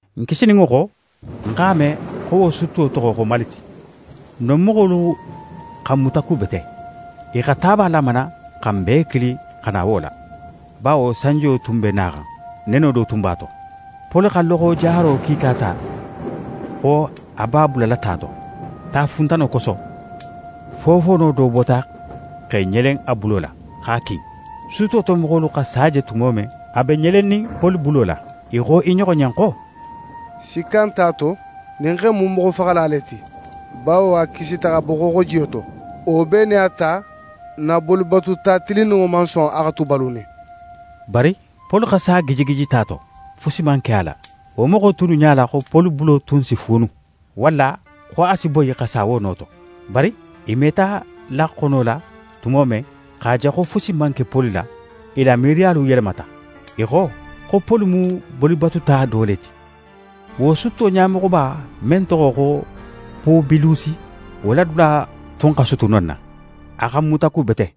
N kisininŋo xo, n x'a me xo wo sutto toxo xo Malite. Non moxolu xa n mutakubete. I xa taba lamana xa n bee kili xa na wo la, bawo sanjiyo tun be naxan, neno du tun b'a to. Poli xa loxo jaro kiika ta xo a b'a bulala ta to. Tafuntano koso, fofoono do bota x'é ɲelen a bulo la, x'a kin. Sutto to moxolu xa sa je tumo men a be ɲelennin Poli bulo la, i xo i ɲoxo ɲen xo: «Sikka nt'a to, ɲin xe in mu moxofaxala le ti; bawo a kisita xa bo xooxojiyo to, wo bee nin a ta, n na bolibatuta tilinninŋo man son a xa tu balunin.» Bari Poli xa sa gijigiji ta to. Fusi man ke a la. Wo moxo tunnu ɲala xo Poli bulo tun si fuunu, walla xo a si boyi xa sa wo no to. Bari i meta laxonolo la tumo men, x'a je xo fusi man ke Poli la, i la miiriyalu yelemata. I xo, xo Poli mu bolibatuta do le ti. Wo sutto ɲamoxoba men toxo xo Pubilusi, wo la dula tun xa sutu non na. A xa n mutakubete,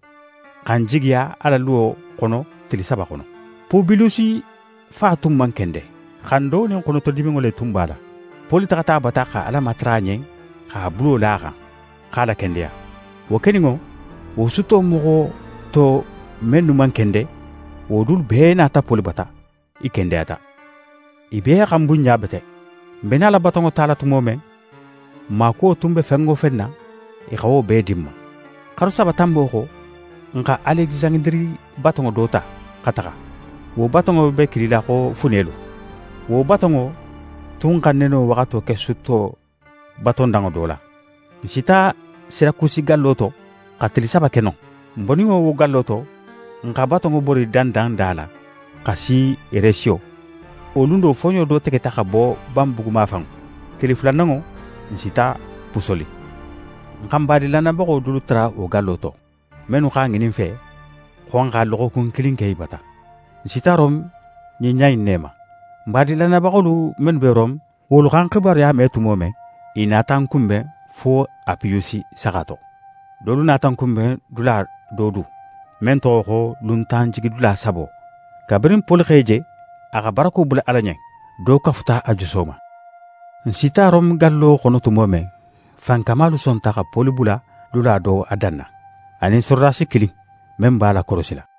xa n jigiya a la luwo xono tili saba xono. Pubilusi fa tun man kende. Xando nin xonotodiminŋo le tun b'a la. Poli taxata a bata xa Ala matara a ɲen x'a bulo la a xan, x'a lakendeya. Wo keninŋo, wo sutto moxo to mennu man kende, wo dulu bee nata Poli bata. I kendeyata. I bee xa n bunɲa bete. N be nala batonŋo tala tumo men, n maakuwo tun be fen wo fen na, i xa wo bee di n ma. Xaru saba tanbo xo, n xa Alekisandiri batonŋo do ta, xa taxa. Wo batonŋo be kilila xo: “Funelu”. Wo batonŋo tun xa neno waxato ke sutto batondanŋo do la. N sita Sirakusi gallo to, xa tili saba ke non. N boninŋo wo gallo to, n xa batonŋo bori dandanda la xa si Resiyo. Wo lun do, foɲo do tegeta xa bo banbugu mafanŋo. Tili fulananŋo, n sita Pusoli. N xa badin lannayabaxo dolu tara wo gallo to, mennu x'a ŋinin n fe, xo n xa loxokun kilin ke i bata. N sita Rome ɲin ɲa in ne ma. Badin lannayabaxolu mennu be Rome, wolu xa n xibaruya me tumo men, i nata n kunben fo Apiyusi Saxa to. Dolu nata n kunben dula do du, men toxo xo “Luntanjigidula Sabo.” Kabirin Poli x'e je, a xa barako bula Ala ɲen, do kafuta a juso ma. N sita Rome gallo xono tumo men, fankamalu sonta xa Poli bula dula do a danna, a nin sorodasi kilin, men b'a lakorosila.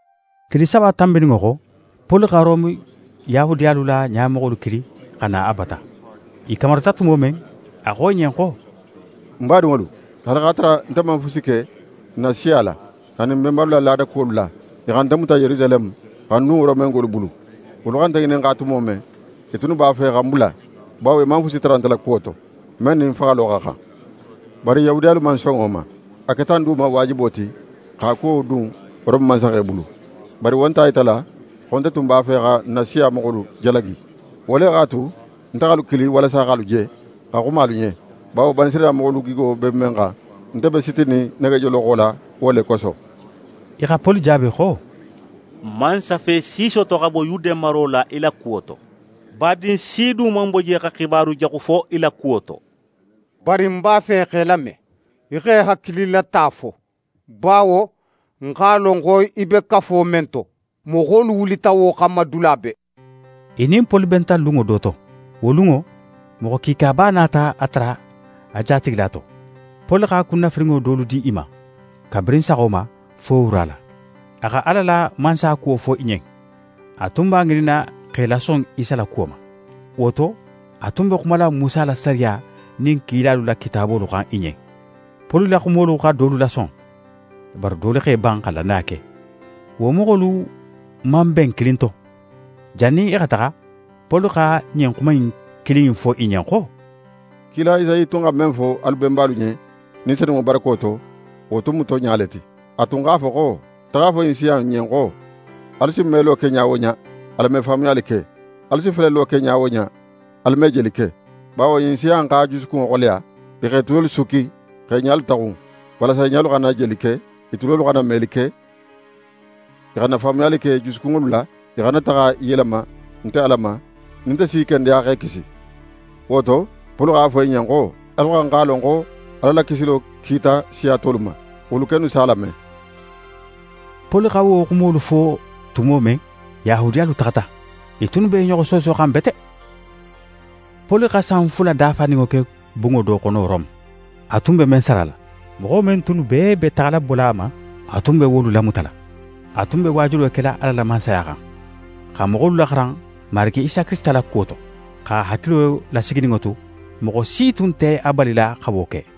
Tili saba tanbininŋo xo, Poli xa Rome Yahudiyalu la ɲamoxolu kili xa na a bata. I kamarita tumo men, a xo i ɲen xo: «Ń badinŋolu, haali x'a tara nte man fusi ke n na siya la, anin n benbalu la laada kuwolu la, i xa nte muta Yerusaleme xa ń dun Romengolu bulu. Wolu xa nte ŋininxa tumo men, i tunnu b'a fe xa ń bula, bawo i man fusi tara nte la kuwo to, men nin faxalo xa xan. Bari Yahudiyalu man son wo ma. A keta ń du ma waajibo ti x'a kuwo dun Rome mansaxe bulu. Bari wo nt'a yitala xo nte tun b'a fe xa ń na siya moxolu jalagi. Wo le x'a tu, nte x'alu kili walasa x'alu je, xa xuma alu ɲen; bawo Banisirayila moxolu gigo be men xan, nte be sitinin negejoloxo la wo le koso.» I xa Poli jaabi xo: «N man safe si soto xa bo Yude maro la í la kuwo to. Badin si du man bo je xa xibaru jaxu fo í la kuwo to. Bari n b'a fe x'é lame, í x'é hakililata fo, bawo n x'a lon xo í be kafo men to, moxolu wulita wo xanma dula bee.» I nin Poli benta lunŋo do to. Wo lunŋo, moxo kiikaba nata a tara a jatigila to. Poli xa kunnafirinŋo dolu di i ma, kabirin saxo ma, fo wura la. A xa Ala la Mansaya kuwo fo i ɲen. A tun b'a ŋininna x'e lason Isa la kuwo ma. Wo to, a tun be xumala Musa la sariya nin kilalu la kitaabolu xan i ɲen. Poli la xumolu xa dolu lason; bari dolu x'e ban xa lannaya ke. Wo moxolu man ben kilin to. Jannin i xa taxa, Poli xa ɲin xuma kilin in fo i ɲen xo: «Kila Esayi tun xa men fo alu benbalu ɲen, Ni Senunŋo barako to, wo tun mu tonɲa le ti. A tun x'a fo xo: “Taxa a fo ɲin siya in ɲen xo: Alu si melo ke ɲa wo ɲa, alu me faamuyali ke, alu si felelo ke ɲa wo ɲa, alu me jeli ke. Bawo ɲin siya in x'a jusukunŋo xoleya, i x'e tulolu sukki x'e ɲalu taxun walasa i ɲalu xana jeli ke, i tulolu xana meli ke, i xana faamuyali ke i jusukunŋolu la, i xana taxa i yelema nte Ala ma nin nte si i kendeya x'e kisi.” Wo to, Poli x'a fo i ɲen xo: “Alu xa xan x'a lon xo Ala la kisilo kita siya tolu ma. Wolu kennu s'a lame!”» [ Poli xa wo xumolu fo tumo men, Yahudiyalu taxata. I tunnu be i ɲoxo soosoxan bete.] Poli xa san fula dafaninŋo ke bunŋo do xono Rome, a tun be men sarala. Moxo men tunnu bee be taxala bola a ma, a tun be wolu lamutala. A tun be waajulo kela Ala la Mansaya xan, xa moxolu laxaran Marigi Isa Kirisita la kuwo to, x'a hakilo lasigininŋo tu, moxo si tun nte a balila xa wo ke.